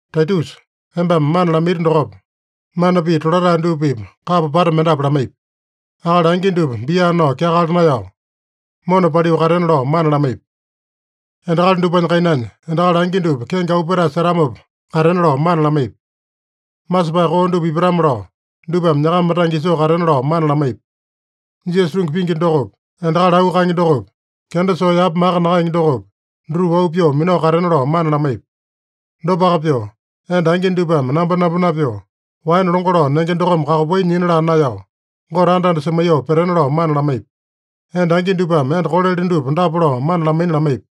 Taitusa, embame mana lamaiti dokopa, mana pii tolatae dupa-pipa kapa pata mendapu lamaipi. Akali angi dupa bia nao kyakala naeyao, mona paliu katena lao mana lamaipi. Endakali dupanya kainanya endakali angi dupa kenge auu petae setamopa katena lao mana lamaipi. Masepae koo dupa ipatame-lao dupame nyakama tange isoo katena lao mana lamaipi. Jisasa tungi pingi dokopi, endakali auu kaenge dokopi, kenda soo yapa maka nakaenge dokopi, dutupa auu pyoo minao katena lao mana lamaipi. Dopaka pyoo, enda angi dupame nambonambo napyoo, waene longo lao nenge dokome kakopai nyina laa naeyao, Gote anda-anda semaiyoo petena lao mana lamaipi. Enda angi dupame enda kolele dupa dapa lao mana lamaina lamaipi: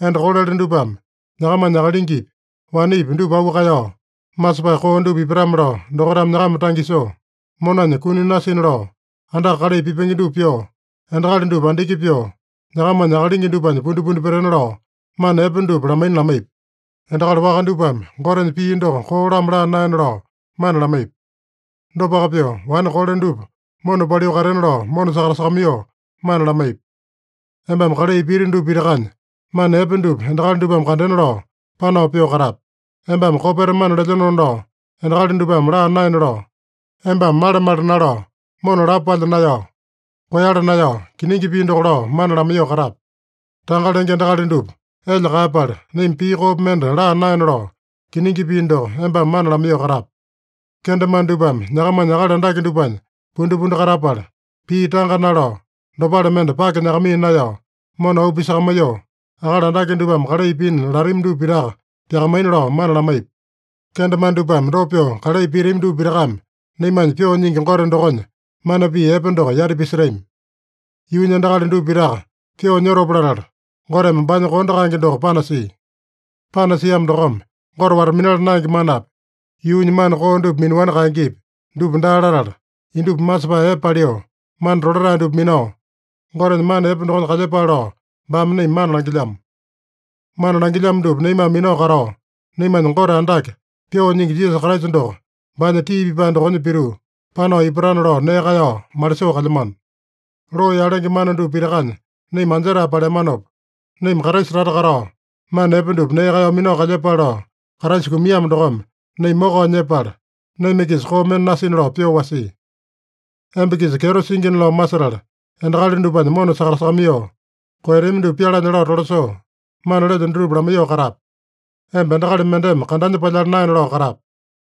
Enda kolele dupame nyakamanya akalingipi, wanepi dupa auu kaeyao, masepae koo dupa ipatame-lao dokaitame nyakama tange isoo, monanya kuni nasina lao, andaka kalai pipenge dupa pyoo, endakali dupa andiki pyoo, nyakamanya akalingi dupanya pundipundi petena lao, mana epe dupa lamaina lamaipi. Endakali waka dupame Gotenya pii doko koo-lamo laa naena lao mana lamaipi. Dopaka pyoo, wane kole dupa mona paliu katena lao mona sakatasakamaiyoo mana lamaipi. Embame kalai piti dupa pitakanya, mana epe dupa endakali dupame kandena lao, panao pyoo katape. Embame kopeta mana lelyenona lao endakali dupame laa naena lao, embame male-male nalao, mona lapo palya naeyao, koeyala naeyao, kiningi pii doko lao mana lamaiyoo katape. Tanga lenge endakali dupa elya kaeyapala, naima pii koopi mende laa naena lao, kiningi pii doko embame mana lamaiyoo katape. Kendemane dupame nyakamanya akali andake dupanya pundipundi katapala, pii tanga nalao, dopale mende pake nyakamaiya naeyao, mona auu pisakamaiyoo, akali andake dupame kalai pina latami dupa pitaka pyakamaina lao mana lamaipi. Kendemane dupame dopa pyoo kalai pitami dupa pitakame naimanya Pyoo Nyingi Gote dokonya mana pii epe doko yati pisetami. Yuunya endakali dupa pitaka pyoo nyotopa latala, Goteme baanya kondo kaenge doko panasia. Panasiamo dokome, Gote wata-minala naenge manapi, yuunya mana koo dupa minaowani kaengepi, dupa daa latala, indupa masepae epe paliu, mana tolatae dupa minao, Gotenya mana epe dokonya kalyepale lao baame naima mana langilyamo. Mana langilyamo dupa naimame minao katao, naimanya Gote Andake, Pyoo Nyingi Jisasa Kraisa doko, baanya tii pipae dokonya pituu, panao ipatana lao nee kaeyao malisoo kalyamano. Loo yalenge mana dupa pitakanya naima anjetae paleamanopa, naima Kraisa tata katao, mana epe dupa nee kaeyao minao kalyepale lao, Kraisa kumiamo dokome, naima mokao nyepala, naima-kisa koo mende nasina lao pyoo wasia. Emba-kisa kyeto singina lao masetala, endakali dupanya mona sakatasakamaiyoo, koeyatami dupa pyalanya lao tolasoo, mana lelyo dutupa lamaiyoo katape. Emba endakali mendeme kandanya palyala naena lao katape.